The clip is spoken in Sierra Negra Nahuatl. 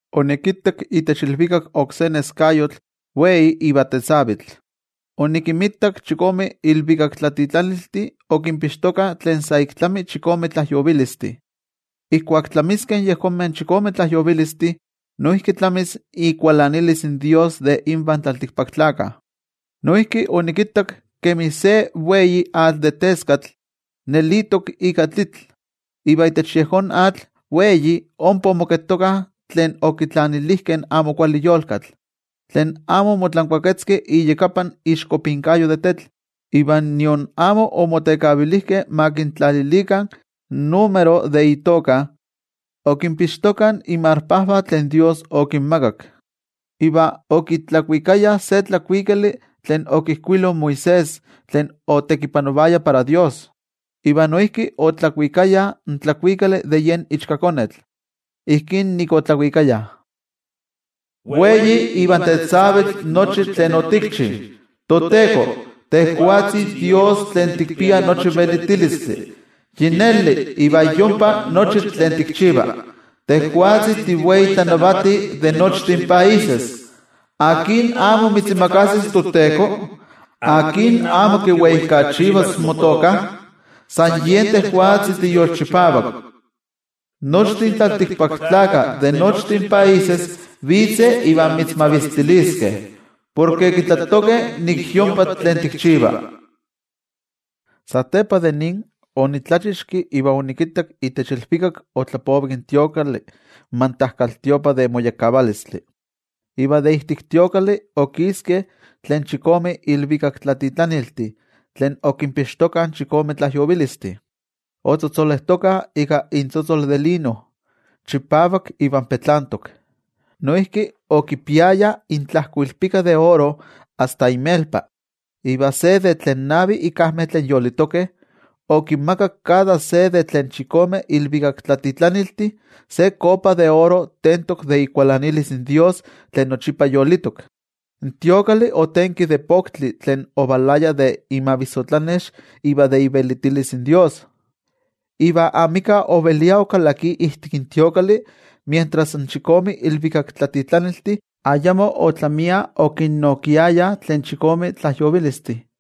Onikittak itech ilvikak oksé neskayotl wei iva tetzavitl. Onikinmitak chikome ilvikaktlatitlaniltih okinpixtokah tlen sa ik tlami chikome tlajyovilistih. Ijkuak tlamiskeh in yejonmeh chikome tlajyovilistih, noijki tlamis ikualanilis in toYejwatzi de invan tlaltikpaktlakah. Noijki onikittak kemi se wei atl de teskatl nelitok ika tlitl. Iva itech yejón atl wei ompa omoketokah tlen okitlanilijkeh in amo kuali yolkatl, tlen amo omotlankuaketzkeh iyakapan ixkopinkayo de tetl, iva nion amo omotekavilijkeh ma kintlalilikah in número de itoka. Okinpixtokah inmarpajvah tlen toYejwatzi okinmakak. Iva okitlakuikayah se tlakuikali tlen okijkuilo Moisés tlen otekipanovaya para toYejwatzi, iva noijki okitlakuikayah in tlakuikali de yen Ichkakonetl. Ijkí nik otlakuikayah: Wei iva tetzavitl nochi tlen otikchi, toTeko, tejwatzi Dios tlen tikpia nochi velitilistli. Yi neli iva yompa nochi tlen tikchiva, tejwatzi tiwei tlanavati de nochtin países. ¿Akin amo mitzimakasis, toTeko? ¿Akin amo kiweijkachivas motoka? San yen tejwatzi tiyolchipavak. Nochtin tlaltikpaktlakah de nochtin países vitzeh iva mitzmavistiliskeh, porke kitlatokeh nik yompa tlen tikchiva. Satepa de nin, onitlachixki iva onikittak itech ilvikak otlapovik in templo, in mantajkaltiopa de moyekkavalistli. Iva de ijtik templo okiskeh tlen chikome ilvikaktlatitlaniltih tlen okinpixtokah in chikome tlajyovilistih. Otzotzolejtokah ika intzotzol de lino, chipavak iva petlantok. Noijki okipiayah intlajkoilpika de oro asta inmelpa. Iva se de tlen navi ikajmeh tlen yolitokeh, okinmakak kada se de tlen chikome ilvikaktlatitlaniltih, se kopa de oro tentok de ikualanilis in toYejwatzi tlen yolitok. In templo otenki de poktli tlen ovalaya de imavissotlanex iva de ivelitilis in toYejwatzi. Iva amika ovelia okalakia ijtik templo mientras in chikome ilvikaktlatitlaniltih ayamo otlamia okinnokiayah tlen chikome tlajyovilistih.